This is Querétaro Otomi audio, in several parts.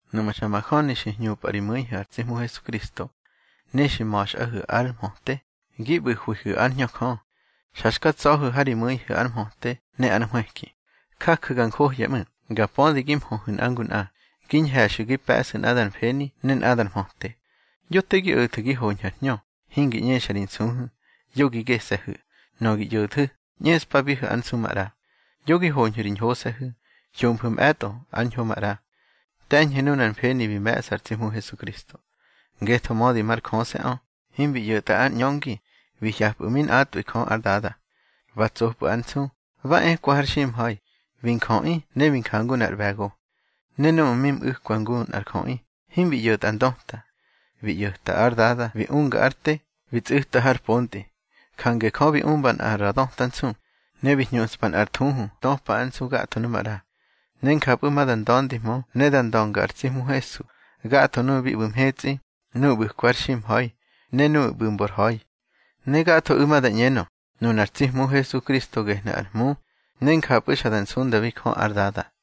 Nuꞌmu̱ xa majöni xi hñupꞌa ri mu̱ihu̱ ar tsi Hmu Hesukristo, ne xi ma̱xꞌahu̱ ár mhöte, gi ꞌbu̱hwihu̱ ár Hñö Jö, xa xka tsa̱hu̱ ha ri mu̱ihu̱ ár mhöte ne ár nhwëki, jaju̱ ga njohya ꞌmu̱, ga pödi gi mhöhu̱ nꞌa ngu nꞌa, gi ñhe̱xu̱ gi pe̱ꞌsu̱ nꞌadar mfeni ne nꞌadar mhöte. Yo te gi o̱thu̱ gi hoñhu̱ ar hñö, hingi ꞌñexa ri nsuhu̱, yo gi gese̱hu̱. Nöꞌö gi ꞌyo̱thu̱, ꞌñeꞌspabihu̱ ár nsu maꞌra. Yo gi hoñhu̱ ri ñhose̱hu̱. Hyomfu̱ mꞌe̱tꞌo ár ñho maꞌra. Te̱ñhu̱ nunar mfeni bi me̱ꞌsa ar tsi Hmu Hesukristo. Ngetho mödi mar Jöse̱ꞌö, himbi ꞌyo̱tꞌa ár ꞌñöngi bi hye̱pꞌu̱ mi nꞌatꞌwi Jö ár Dada. Ba tsopꞌu̱ ár nsu, ba ekwa har ximha̱i, bi njöꞌi ne bi njangu nꞌar ꞌbe̱go. Ne núꞌmu̱ mi mꞌu̱kwa ngu nꞌar jöꞌi, himbi ꞌyo̱tꞌa ndöta. Bi ꞌyo̱ta ár Dada bi unga ár te, bi tsꞌu̱ta har pontꞌi. Jange Jö bi umba nꞌa ra döta nsu, ne bi hñuꞌspa nꞌar thuhu töpa ár nsu gatho nu maꞌra. Ne njapꞌu̱ ma da nda̱ndihmö ne da ndönga ar tsi Hmu Hesu gatho nuꞌu̱ bi ꞌbu̱ mhetsꞌi, nuꞌu̱ ꞌbu̱kwa har ximha̱i, ne nuꞌu̱ ꞌbu̱ mbor ha̱i. Ne gathoꞌu̱ ma da ꞌñenö, nunar tsi Hmu Hesukristo gehnu̱ ar Hmu, ne njapꞌu̱ xa da nsundabi Jö ár Dada.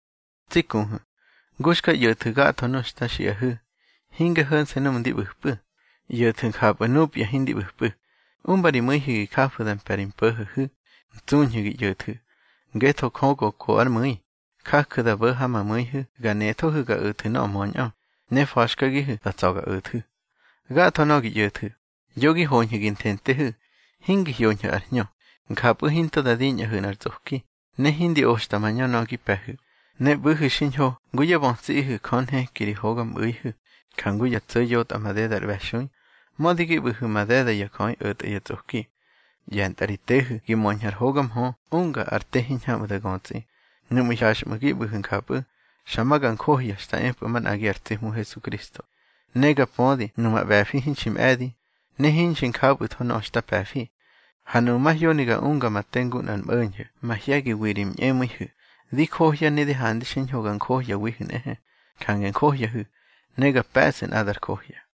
Tsi kuhu̱, ngu xka ꞌyo̱thu̱ gatho nöꞌö xta xiꞌahu̱, hinge ho̱nse̱ núꞌmu̱ ndi ꞌbu̱pꞌu̱, ꞌyo̱thu̱ njapꞌu̱ nupya hindi ꞌbu̱pꞌu̱. Umba ri mu̱ihu̱ gi jafu̱ da mpe̱ ri mpo̱ho̱hu̱, ntsuñhu̱ gi ꞌyo̱thu̱. Ngetho Jö go ko ár mu̱i, jaju̱ da bo̱ ha ma mu̱ihu̱ ga nethohu̱ ga o̱thu̱ nöꞌö möñꞌö, ne fa̱xkagihu̱ da tsa̱ ga o̱thu̱. Gatho nöꞌö gi ꞌyo̱thu̱, yo gi hoñhu̱ gi nthentehu̱, hingi hyoñhu̱ ar hñö. Njapꞌu̱ hinto da diñꞌahu̱ nꞌar tsꞌoki, ne hindi oxta mañö nöꞌö gi pe̱hu̱. Ne ꞌbu̱hu̱ xiñho ngu yá bötsiꞌihu̱ Jö nheki ri hogamꞌu̱ihu̱, jangu ya tso̱ yotꞌa madeda ar ꞌbe̱xui, mödi gi ꞌbu̱hu̱ madeda ya jöꞌi o̱tꞌa ya tsꞌoki. ꞌYe̱ntꞌa ri tehu̱ gi möñhu̱ ar hoga mhö unga ar te hiñhamꞌu̱ da götsꞌi. Nuꞌmu̱ hyaxꞌmu̱ gi ꞌbu̱hu̱ njapꞌu̱, xa ma ga njohya xta epꞌu̱ manꞌagi ar tsi Hmu Hesukristo. Ne ga pödi numa ꞌbe̱fi hinxi mꞌe̱di, ne hinxi njapꞌu̱tho nöꞌö xta pe̱fi. Ha nuꞌmu̱ mahyoni ga unga ma te ngu nꞌar mꞌo̱ñho̱ mahye̱giwi ri ñꞌemu̱ihu̱, di johya ne di handi xiñho ga njohyawihu̱ nꞌehe. Jange njohyahu̱, ne ga pe̱ꞌsu̱ nꞌadar johya.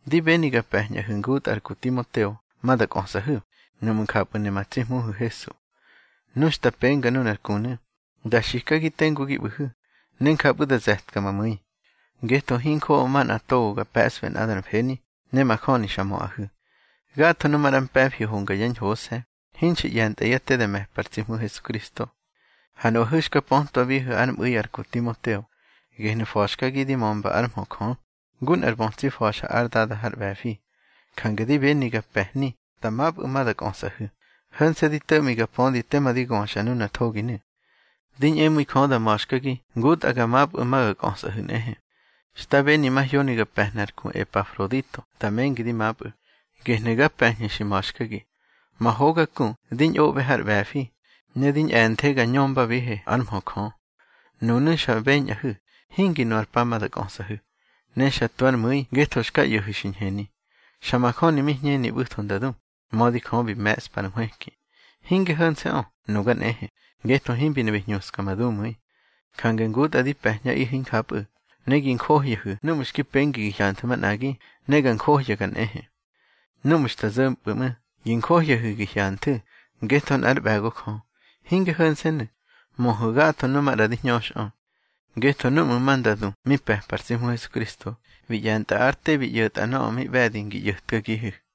Di beni ga pe̱ñꞌahu̱ ngutꞌa ar ku Timoteo ma da kꞌösꞌahu̱, nuꞌmu̱ njapꞌu̱ ne ma tsi Hmuhu̱ Hesu. Nu xta penga nunar kunu̱, da xikagi tengu gi ꞌbu̱hu̱, ne njapꞌu̱ da ze̱tka ma mu̱i. Ngetho hinjoꞌo manꞌa togo gar pe̱sꞌbe nꞌadar mfeni, ne majöni xa möꞌahu̱. Gatho nu maꞌra mpe̱fi honga yá ñhose̱, hinxi ꞌye̱ntꞌa yá te da me̱pa ar tsi Hmu Hesukristo. Ha nuꞌahu̱ xka pötwabihu̱ ár mꞌu̱i ar ku Timoteo. Gehnu̱ fa̱xkagi di mömba ár mhö Jö, ngu nꞌar bötsi fa̱xa ár dada har ꞌbe̱fi. Jange di beni ga pe̱hni da mapꞌu̱ ma da kꞌösꞌahu̱, ho̱nse̱ di to̱ꞌmi ga pödi tema di göxa nunar thoginu̱. Di ñꞌemu̱i Jö da ma̱xkagi ngutꞌa ga mapꞌu̱ ma ga kꞌösꞌahu̱ nꞌehe. Xta beni mahyoni ga pe̱hna ar ku Epafrodito da mengi di mapꞌu̱, gehnu̱ ga pe̱ñhu̱ xi ma̱xkagi. Ma hoga ku di ñꞌoꞌbe har ꞌbe̱fi, ne di ñꞌe̱nthe ga ñömbabihe ár mhö Jö. Nunu̱ xa beñꞌahu̱, hingi nu ar pa ma da kꞌösꞌahu̱, ne xa tu ár mu̱i ngetho xka ꞌyo̱hu̱ xi ñheni. Xa majöni mi hñeni ꞌbu̱tho nda du, mödi Jö bi me̱ꞌspa ar nhwëki. Hinge ho̱nse̱ꞌö, nuga nꞌehe, ngetho himbi ne bi hñuska ma dumu̱i. Jange ngutꞌa di pe̱ñꞌaꞌihu̱ injapꞌu̱, ne gi njohyahu̱ núꞌmu̱ xki pengi gi hyanthu̱ manꞌagi, ne ga njohyaga nꞌehe. Núꞌmu̱ xta zo̱mpꞌu̱ ꞌmu̱, gi njohyahu̱ gi hyanthu̱, ngetho nꞌár ꞌbe̱go Jö. Hinge ho̱nse̱nu̱, möhu̱ gatho nuꞌu̱ maꞌra di hñöxꞌö. Ngetho núꞌmu̱ ma nda du mi pe̱pa ar tsi Hmu Hesukristo, bi ꞌye̱ntꞌa ár te bi ꞌyo̱tꞌa nöꞌö mi ꞌbe̱di ngi ꞌyo̱tkagihu̱.